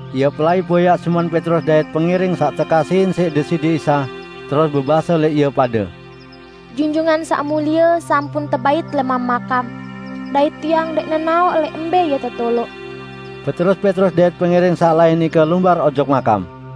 Ie pelai boyaq Simon Petrus dait pengiring saq tekasihin siq Deside Isa, terus bebase lẽq ie pade, "Junjungan Saq Mulie sampun tebait lẽman makam, dait tiang ndẽq nenaoq lẽq mbẽ Ie tetoloq." Beterus Petrus dait pengiring saq lain nike lumbar ojok makam.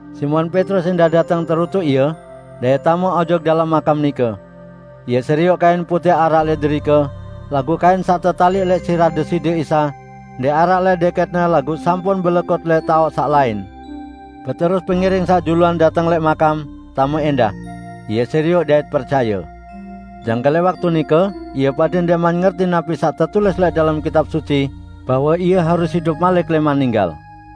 Simon Petrus ẽndah dateng terutuk ie, dait tame ojok dalem makam nike. Ie serioq kain putẽq araq lẽq derike, laguq kain saq tetaliq lẽq sirah Deside Isa ndẽq araq lẽq dẽkẽtne laguq sampun belekut lẽq taoq saq lain. Beterus pengiring saq juluan dateng lẽq makam, tame ẽndah. Ie serioq dait percaye. ( Jangke lẽq waktu nike ie pade ndẽqman ngerti napi saq tetulis lẽq dalem Kitab Suci bahwe Ie harus idup malik lẽman ninggal.)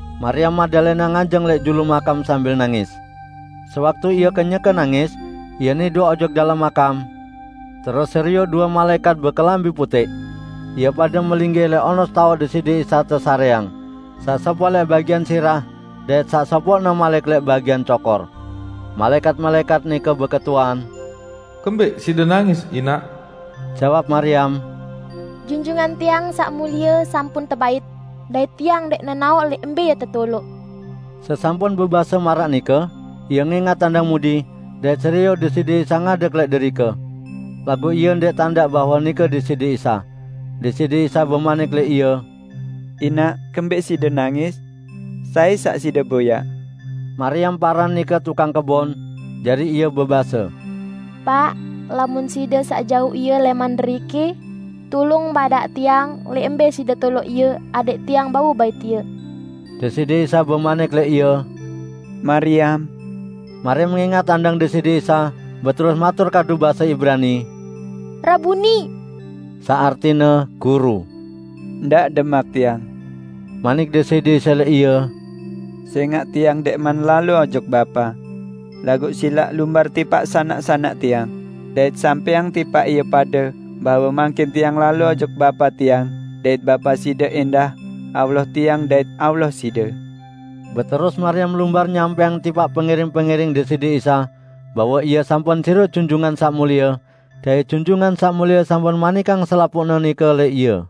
Mariam Magdalena nganjeng lẽq julu makam sambil nangis. Sewaktu ie kenyeke nangis, ie nidok ojok dalem makam, terus serioq due malaẽkat bekelambi putẽq. Ie pade melinggih lẽq onos taoq Deside Isa tesarẽang, saq sopoq lẽq bagian sirah, dait saq sopoqne malik lẽq bagian cokor. Malaẽkat-malaẽkat nike beketuan, "Kembẽq side nangis, inaq?" Jawab Mariam, "Junjungan tiang Saq Mulie sampun tebait, dait tiang ndẽq nenaoq lẽq mbẽ Ie tetoloq." Sesampun bebase maraq nike, ie ngẽngat andang mudi, dait serioq Deside Isa ngadeg lẽq derike. Laguq ie ndẽq tandaq bahwe nike Deside Isa. Deside Isa bemanik lẽq ie, "Inaq, kembẽq side nangis? Sai saq side boyaq?" Mariam paran nike tukang kebon, jari ie bebase, "Paq, lamun Side saq jauq Ie lẽman deriki, tulung badaq tiang lẽq mbẽ Side toloq Ie, adẽq tiang bau bait Ie." Deside Isa bemanik lẽq ie, "Mariam!" Mariam ngẽngat andang Deside Isa, beterus matur kadu base Ibrani, "Rabuni!" (Saq artine, "Guru".) "Ndaq demak Tiang," manik Deside Isa lẽq ie, "sẽngaq Tiang ndẽqman lalo ojok Bapa. Laguq silaq lumbar tipaq sanak-sanak Tiang, dait sampẽang tipaq ie pade bahwe mangkin Tiang lalo ojok Bapa Tiang dait Bapa side ẽndah, Allah Tiang dait Allah side." Terus Mariam lumbar nyampẽang tipaq pengiring-pengiring Deside Isa bahwe ie sampun serioq Junjungan Saq Mulie, dait Junjungan Saq Mulie sampun manikang selapuqne nike lẽq ie.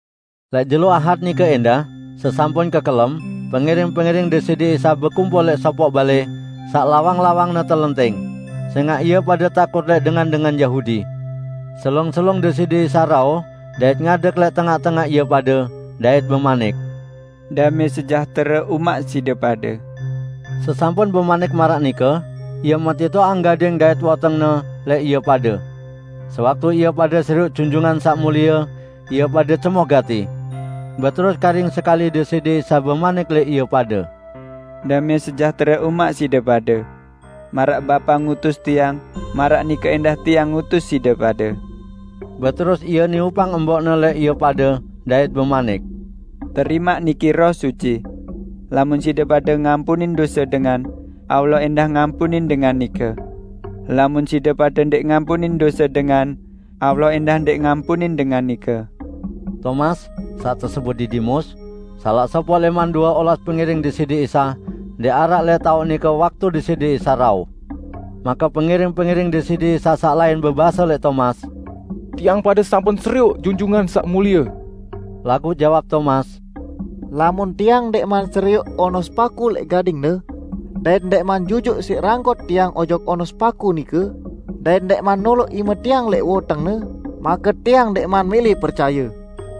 Lẽq jelo Ahad nike ẽndah, sesampun kekelem, pengiring-pengiring Deside Isa bekumpul lẽq sopoq balẽ saq lawang-lawangne telenting, sẽngaq ie pade takut lẽq dengan-dengan Yahudi. Selung-selung Deside Isa rauh dait ngadeg lẽq tengaq-tengaq ie pade, dait bemanik, "Damẽ sejahtere umaq side pade." Sesampun bemanik maraq nike, Ie metitoqang gading dait woteng-Ne lẽq ie pade. Sewaktu ie pade serioq Junjungan Saq Mulie, ie pade cemoh gati. Beterus karing sekali Deside Isa bemanik lẽq ie pade, "Damẽ sejahtere umaq side pade! Maraq Bapa ngutus Tiang, maraq nike ẽndah Tiang ngutus side pade." Beterus Ie niupang embok-Ne lẽq ie pade dait bemanik, "Terimaq niki Roh Suci. Lamun side pade ngampunin dose dengan, Allah ẽndah ngampunin dengan nike. Lamun side pade ndẽq ngampunin dose dengan, Allah ẽndah ndẽq ngampunin dengan nike." Tomas (saq tesebut Didimus), salaq sopoq lẽman due olas pengiring Deside Isa, ndẽq araq lẽq taoq nike waktu Deside Isa rauh. Make pengiring-pengiring Deside Isa saq lain bebase lẽq Tomas, "Tiang pade sampun serioq Junjungan Saq Mulie!" Laguq jawab Tomas, "Lamun tiang ndẽqman serioq onos paku lẽq gading-Ne, dait ndẽqman jujuq siq ranggot tiang ojok onos paku nike dait ndẽqman noloq ime tiang lẽq woteng-Ne, make tiang ndẽqman mẽlẽ percaye."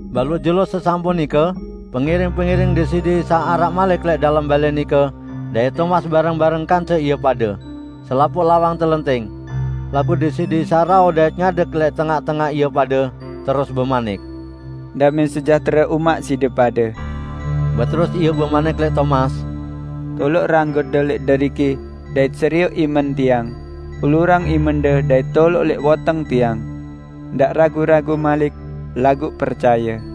Baluq jelo sesampun nike pengiring-pengiring Deside Isa araq malik lẽq dalem balẽ nike dait Tomas bareng-bareng kance ie pade. Selapuq lawang telenting. Laguq Deside Isa rauh dait ngadeg lẽq tengaq-tengaq ie pade, terus bemanik, "Damẽ sejahtere umaq side pade." Beterus Ie bemanik lẽq Tomas, "Toloq ranggotde lẽq deriki dait serioq imen Tiang, ulurang imende dait toloq lẽq woteng Tiang. Ndaq ragu-ragu malik, laguq percaye!"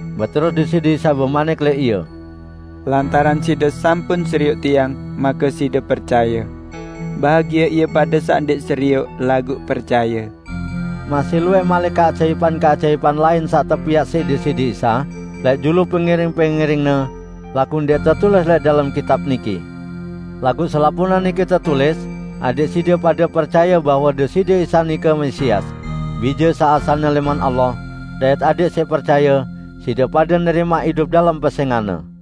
Beterus Deside Isa bemanik lẽq ie, "Lantaran side sampun serioq Tiang, make side percaye. Bahagie ie pade saq ndẽq serioq, laguq percaye." Masih luwẽq malik keajaipan-keajaipan lain saq tepiaq siq Deside Isa lẽq julu pengiring-pengiring-Ne, laguq ndẽq tetulis lẽq dalem kitab niki. Laguq selapuqne niki tetulis, adẽq side pade percaye bahwe Deside Isa nike Mesias, Bije saq asalne lẽman Allah, dait adẽq siq percaye, side pade nerimaq idup dalem pesẽngan-Ne.